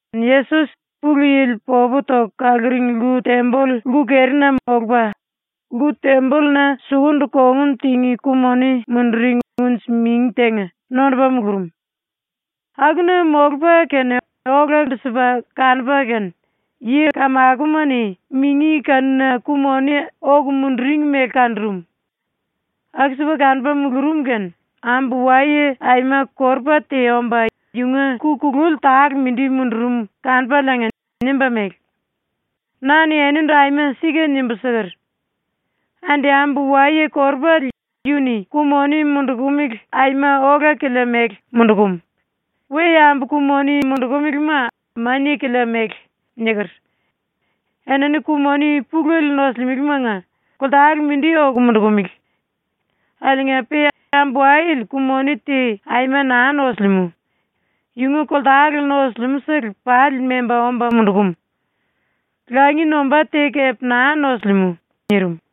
Yesos ⸤Pulu Yili popu toku kaluring lku-temboll lku-kerina molupa⸥ lku-tembolluna sukundu kongun tingí ku-moni munduring unji-mingi tenga nondupa mulurum. Akuna molupa kene olandu-sipa kanupa kene yi-kamakoma-ni mingi kanuna ku-moni oku munduring mele kanurum. ⸤Aku-sipa kanupa mulurum kene⸥ ambu-waye aima korupa te omba yunga ku kululi tale mindi mundurum kanupaliinga nimba mele: “Na-ni enindu aima sika nimbu siker: “Andi ambu-waye korupale yu-ni ku-moni mundukumele aima ola-kilia mele mundukum, we-yambu ku-moni mundukumelema mania-kilia mele.” niker. Enini ku-moni pulele nosulimelemanga koltale mindi oku mundukumele. Akiliinga-pe ambu-wayele ku-moni te aima naa nosilimú. Yunga koltale nusum-sele pali memba omba mundum. Langi nombá te kepe naa nosilimú.” nirim.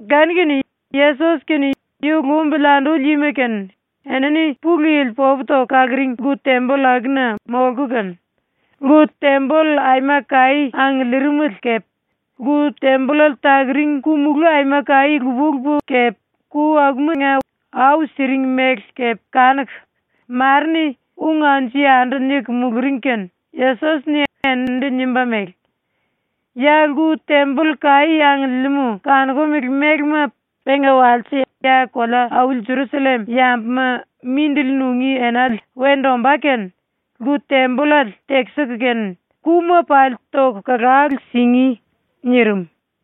Kanu-kene Yesos kene yu lumbili anduli yima kene enini ⸤Pulu Yili popu toku kaluring⸥ lku-temboll akuna molku kene lku-temboll aima kaí angiliirim mele kepe lku-tembollale takuring ku-mulú aima kaí lupa-lupa kepe ku akuma-ni au siring mele kepe kanuku, mare-ni ung anju-yandu niku muluring kene Yesos-ni eninindu nimba mele: “Ya ⸤lku-temboll kaí angiliimú⸥ kanokumele mélema ⸤penga walse ya kolea-auli Jerusallem yambuma mindili nungí enale wendu ombá kene⸥ lku-tembollale tekisiku kene kuma pali toku kalalu singí.” nirim.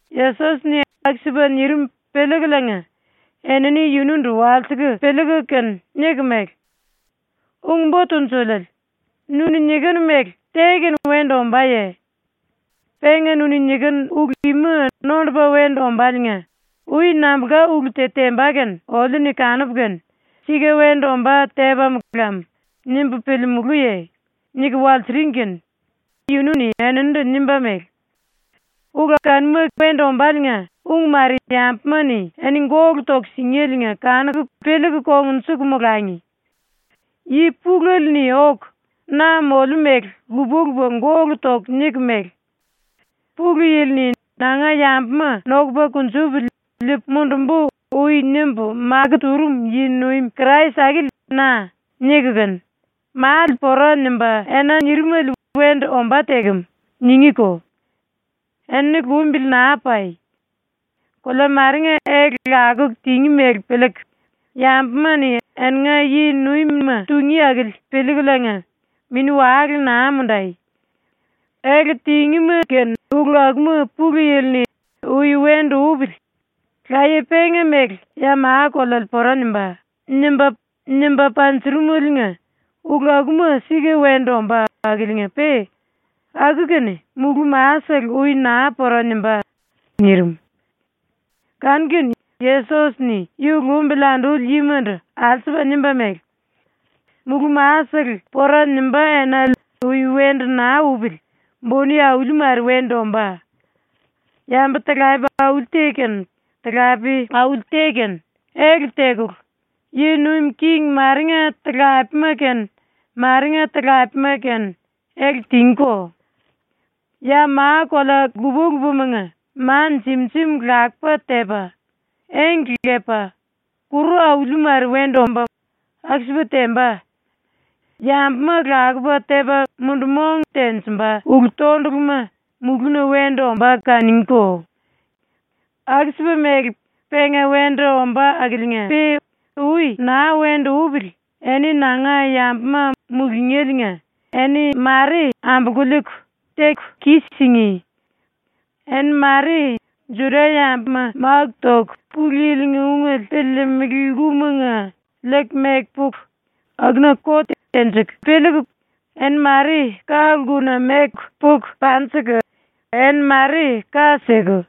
Yesos-ni aku-sipa nirim piliikuliinga enini yunundu walsiku piliiku kene niku mele: “Ung-Bo Tunjuliele, nu-ni nikinu mele te-kene wendu ombáye? Penga nu-ni nikinu ulu ima nondupa wendu ombáliinga ui nambulka ulu te temba kene oliu-ni kanupu kene ‘Sika wendu ombá tepam lam.’ nimbu piliimulúye?” niku walsiring kene yunu-ni eninindu nimba mele: “⸤Ulu kanuma wendu ombáliinga ung mare⸥ yambuma-ni eni gólu toku singéliinga kanuku piliiku kongnjuku molangi. Yi pulele-ni oku na moliu mele lupa-lupa gólu toku niku mele: “⸤Pulu Yili-ni ‘Nanga yambuma nokupa kunjupili liipu mundumbu.’ ui nimba makó turum yi-nuim Krais⸥ akili na.” niku kene, “⸤Male pora nimbá⸥ ena nirimele wendu ombá tekem.” ningíko. Enini lumbili naa pai. Kolea marenga ele lakuku tingí mele piliiku, yambuma-ni eninga yi-nuimima tungí akili piliikuliinga mini-wale naa mundai. Ele tingíma kene ulu akuma Pulu Yili-ni ‘Ui wendu upili. Laye penga mele ya ma-koleale pora nimbá.’ nimba, nimba panjurumeliinga ulu akuma sika wendu ombá akiliinga-pe aku-kene mulú-masele ui naa pora nimbá.” nirim. Kanu-kene Yesos-ni yu lumbili anduli yimandu alsupa nimba mele: “⸤Mulú-masele pora nimbá enale ui wendu naa upili buni auli mare wendu ombá.⸥ Yambu-talape auli te kene talape auli te kene ele tekulu, yi nuim king marenga talapema kene marenga talapema kene ele tingíko. Ya ma-kolea lupa-lupamanga ma jim-jim lakupa tepa, engle lepa, kuru auli mare wendu omba, aku-sipa temba. Yambuma lakupa tepa mundu-mong tenjimba ulu-tonduluma mulúna wendu ombá kanungíko. “Aku-sipa mele ⸤penga wendu ombá akiliinga-pe⸥ ui naa wendu upili eni nanga yambuma mulungéliinga eni ⸤mare⸥ ambolku liiku, teku kis-singí. Eni ⸤mare⸥ Juda-yambuma máku toku Pulu Yili-nga ungele piliilimili lkumanga liiku meku puku ⸤akuna kot tenjiku⸥, eni ⸤mare⸥ ka-lkuna meku puku panjiku, eni ⸤mare ka siku⸥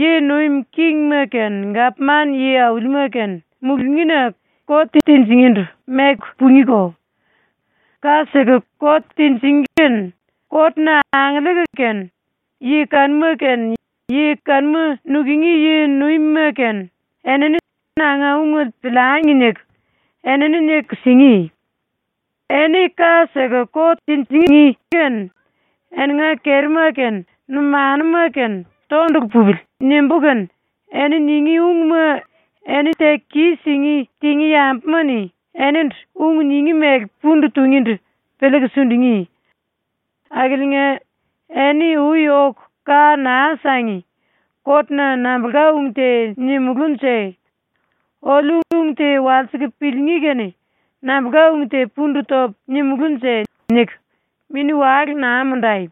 yi nuim kingima kene gapman yi-aulima kene mulungína ⸤kot tinjingíndu⸥ meku pungíko. ⸤Ka siku kot tinjingí kene kot-na angiliiku kene yi kanuma kene yi kanuma nukungí yi-nuimima kene⸥ enini ‘Nanga ungele piliangi.’ niku, enini niku singí. Eni ka siku kot tinjingí kene ‘Eninga kerima kene numanuma kene tondulu pupili.’ nimbú kene eni ningí ungma eni teku kis-singí tingí yambuma-ni enindu ung ningí mele pundu tungíndu piliiku sundungí. Akiliinga eni ui oku ka naa sangi ‘Kotna nambulka ung te nimulúnje? Oliu ung te walsiku piliingí kene nambulka ung te pundu topu nimulúnje?’ niku mini-wale naa mundai.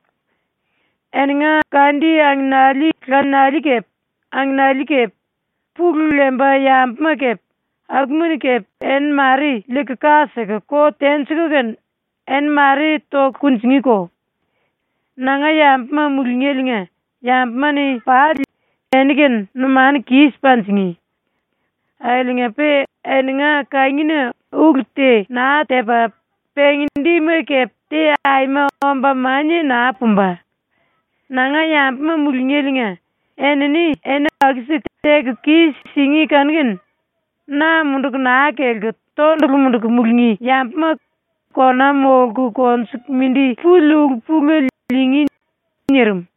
“Eninga kandi aminiali laniali kepe angenali kepe, pulu lemba yambuma kepe, akuma-ni kepe eni mare liiku ka siku kot tenjiku kene eni mare toku kunjingíko. Nanga yambuma mulungéliinga yambuma-ni pali eni-kene numanu kis panjingí. Akiliinga-pe eninga kangina ulu te naa tepa pengi-dima kepe te aima omba mania naa pumba. ⸤Nanga yambuma mulungéliinga enini eni aku-siku teku kis-singí kanu-kene⸥ na munduku naa kelku tondulu munduku mulungí yambuma kona molku konjuku mindi puli ulu-pulele liingí.” ⸤nirim.⸥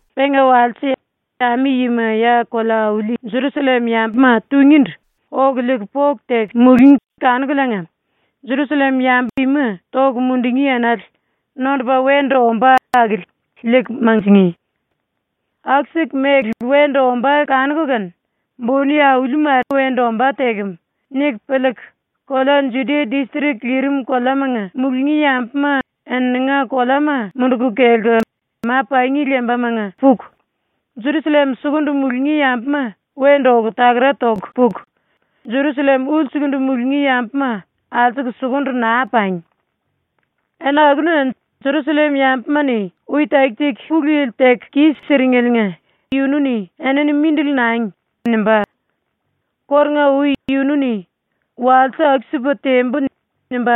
“Penga walse, ami-yima ya kolea-auli Jerusallem-yambuma tungíndu oku liiku poku teku mulungí kanukuliinga Jerusallem-yambu ima toku mundungí enale nondupa wendu ombá akili liiku manjingí. ⸤Aku-siku mele wendu ombá kanuku kene ‘Buni aulima wendu ombá tekem.’ niku piliiku⸥ kolea Judia distrik lirim koleamanga mulungí yambuma ⸤eninga koleama munduku kelku⸥ ma-pangi lembamanga takara toku puku, Jerusallem sukundu mulungí yambuma wendu oku takara toku puku, Jerusallem ulsukundu mulungí yambuma alsuku sukundu naa pangi. Ena akuna Jerusallem-yambuma-ni ui taki-taki Pulu Yili teku kis-siringeliinga yunu-ni “Enini mindili nangi.” nimba. Kórunga-ui yunu-ni ‘Walse aku-sipu tembu.’ nimba,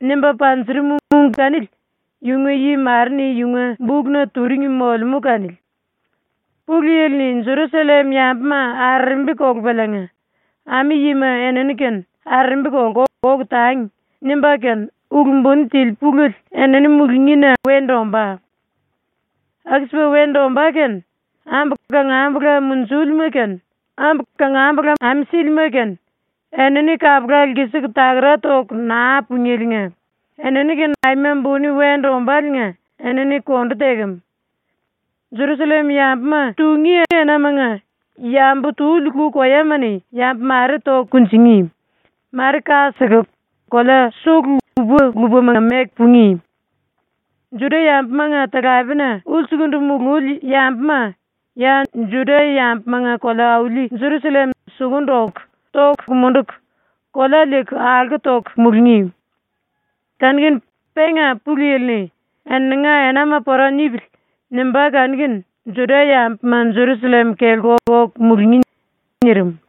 nimba panjurum ung kanili yunga yi mare-ni yunga bukna turing molemú kanili. ⸤Pulu Yili-ni⸥ Jerusallem-yambuma arerembi kolupaliinga ‘Ami-yima enini-kene arerembi kolku oku tangi.’ nimbá kene ulu buni tili pulele enini mulungína wendu ombá. “Aku-sipa wendu ombá kene ambu kangambula munjúlima kene, ambu kangambula ame sílima kene, ⸤enini kapula lkisiku takara toku naa pungéliinga⸥ enini-kene aima buni wendu ombáliinga enini kondu tekem. Jerusallem-yambuma tungí enamanga yambu tuli lu-koyama-ni yambu mare toku kunjingí, mare ka siku kolea sulu lupa-lupamanga meku pungí. Juda-yambumanga talapena ulsukundu mululi yambuma ya Juda-yambumanga kolea-auli Jerusallem sukundu oku toku munduku kolea liiku alko toku mulungí. Kanu-kene penga Pulu Yili-ni ‘Eninga enama pora nipili.’ nimbá kanu-kene Juda-yambuma Jerusallem kelku oku mulungí.” ⸤nirim.⸥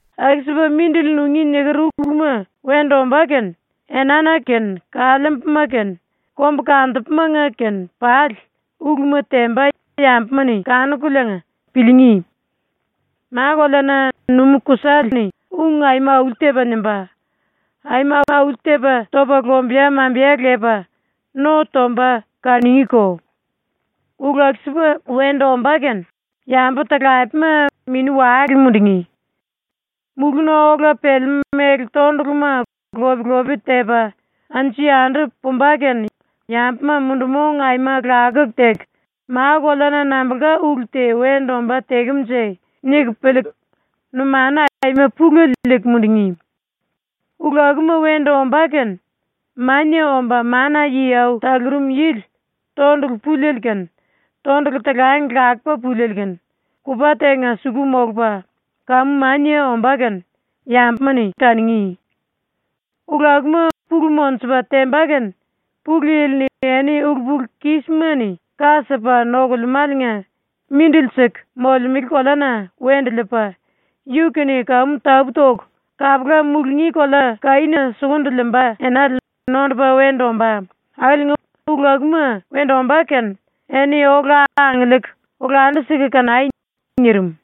“⸤Aku-sipa mindili nungí niker uluma wendu ombá kene⸥ enána kene kaliimbuna kene kombukantupumanga kene ⸤pali⸥ uluma temba yambuma-ni kanukuliinga piliingí. Ma-koleana numú-kusale ung aima auli-tepa nimba, aima auli-tepa topa lombeya-mambeya lepa no tomba kanungíko. Ulu aku-sipa wendu ombá kene yambu-talapema mini-wale mundungí. Mulúna ola pelemú méle-tonduluma lop-lope tepa anju-yandu pumba kene yambuma mundu-mong aima lakuku teku ‘Ma-koleana nambulka ulu te wendu ombá tekemunje?’ niku piliiku numanu aima pulele liiku mundungí. Ulu akuma wendu ombá kene Mania Omba Mana-Yi Au Talurum Yili tondulu puliele kene, tondulu talang lakupa puliele kene, kupa tenga suku molupa, kamu mania ombá ⸤kene⸥ yambuma-ni kanungí. “Ulu akuma pulu monjupa temba kene Pulu Yili-ni eni ulu-pulu-kismani ka sipa nokulemáliinga mindili siku molemele koleana wendu liipa, yu-kene kamu tapú-toku kapula mulungí kolea kaína sukundu liimba enale nondupa wendu ombá akiliinga ulu akuma wendu ombá kene eni ola angiliiku olandu-siku kanai.” ⸤nirim.⸥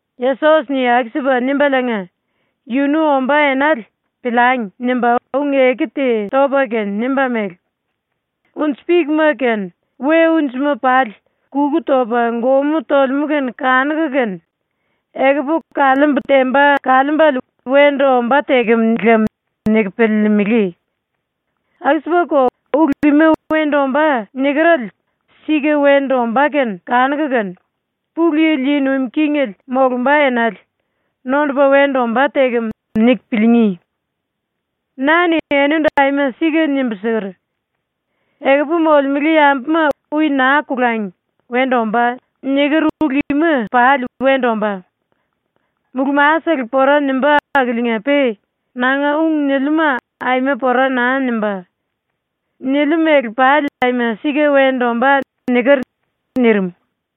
⸤Yesos-ni aku-sipa nimbaliinga, yunu ombá enale ‘Piliangi.’ nimba⸥ ung-eku te topa kene nimba mele: “Unji-pikma kene we-unjima pali kuku topa gomú tolemú kene kanuku kene ‘Ekupu kaliimbu temba kaliimbele wendu ombá tekem lem.’ niku piliilimili. Aku-sipako ulu ima “Wendu ombá.” nikerele sika wendu ombá kene kanuku kene, “Pulu Yili yi nuim kingele molumba enale nondupa wendu ombá tekem.” niku piliingí. “Na-ni enindu aima sika nimbu siker: “Ekupu molemele yambuma ui naa kolangi ⸤“Wendu ombá.” niker⸥ ulu ima pali wendu ombá. Mulú-masele pora nimbá akiliinga-pe nanga ung niliuma aima pora naa nimbá. ⸤Niliu mele pali aima sika wendu ombá.⸥” niker.” ⸤nirim.⸥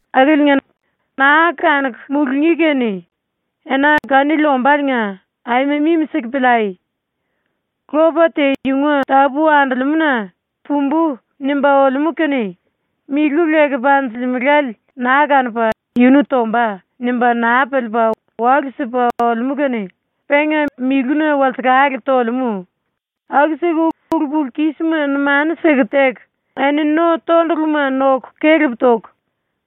“Akiliinga, naa kanuku mulungí kene ena kanili ombáliinga aima mimi-siku piliai! Lopa te yunga tápu andolemúna ‘Pumbú.’ nimba olemú kene milu leku panjilimelale naa kanupa ‘Yunu tomba.’ nimba naa piliipa walu-sipa olemú kene penga miluna walsekale tolemú, aku-siku ulu-pulu-kísima numanu siku teku, eni no-tonduluma noku kelep toku,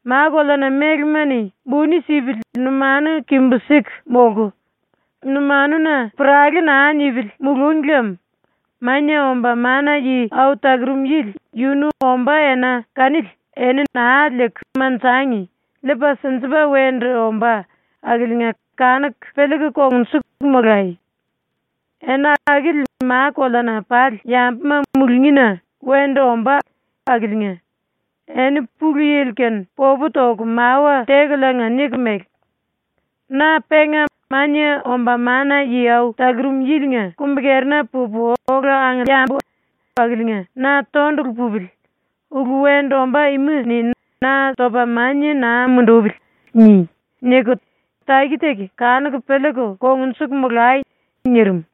ma-koleana mélema-ni buni sipili numanu kimbu-siku molku, numanuna puralé naa nipili mulúngi lem ⸤Mania Omba Mana-Yi Au Talurum Yili⸥ yunu ombá ena kanili eni naa liiku manjangi liipa sinjipa wendu ombá akiliinga kanuku piliiku kongnjuku molai. Ena akili ma-koleana pali yambuma mulungína wendu ombá akiliinga eni Pulu Yili-kene popu toku mawa tekuliinga niku mele: “‘Na penga Mania Omba Mana-Yi Au Talurum Yili-nga kumbi-kerina pupu ola angiliimbu akiliinga na tondulu pupili, ulu wendu ombá ima-ni na topa mania naa mundupili.’ ni.” niku taki-taki kanuku piliiku kongnjuku molai!” nirim.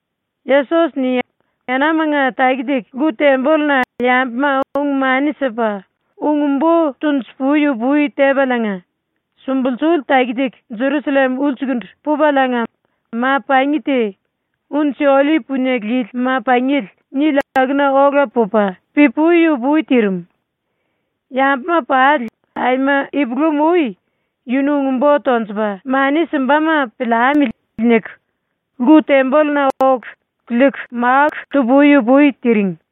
Yesos-ni enamanga taki-taki lku-tembolluna yambuma ung-mani sipa ung-bo tonju-pui-upui tepaliinga, sumbulsuli taki-taki Jerusallem ulsukundu pupaliinga ma-pangi te ‘Unji-Ollip Punie Lili Ma-Pangiele’ nili akuna ola pupa pi-pui-upui tirim. Yambuma pali aima ipulam-ui ‘Yunu ung-bo tonjupa mani simbama piliamili.’ niku lku-tembolluna oku liiku máku tu-pui-upui tiring.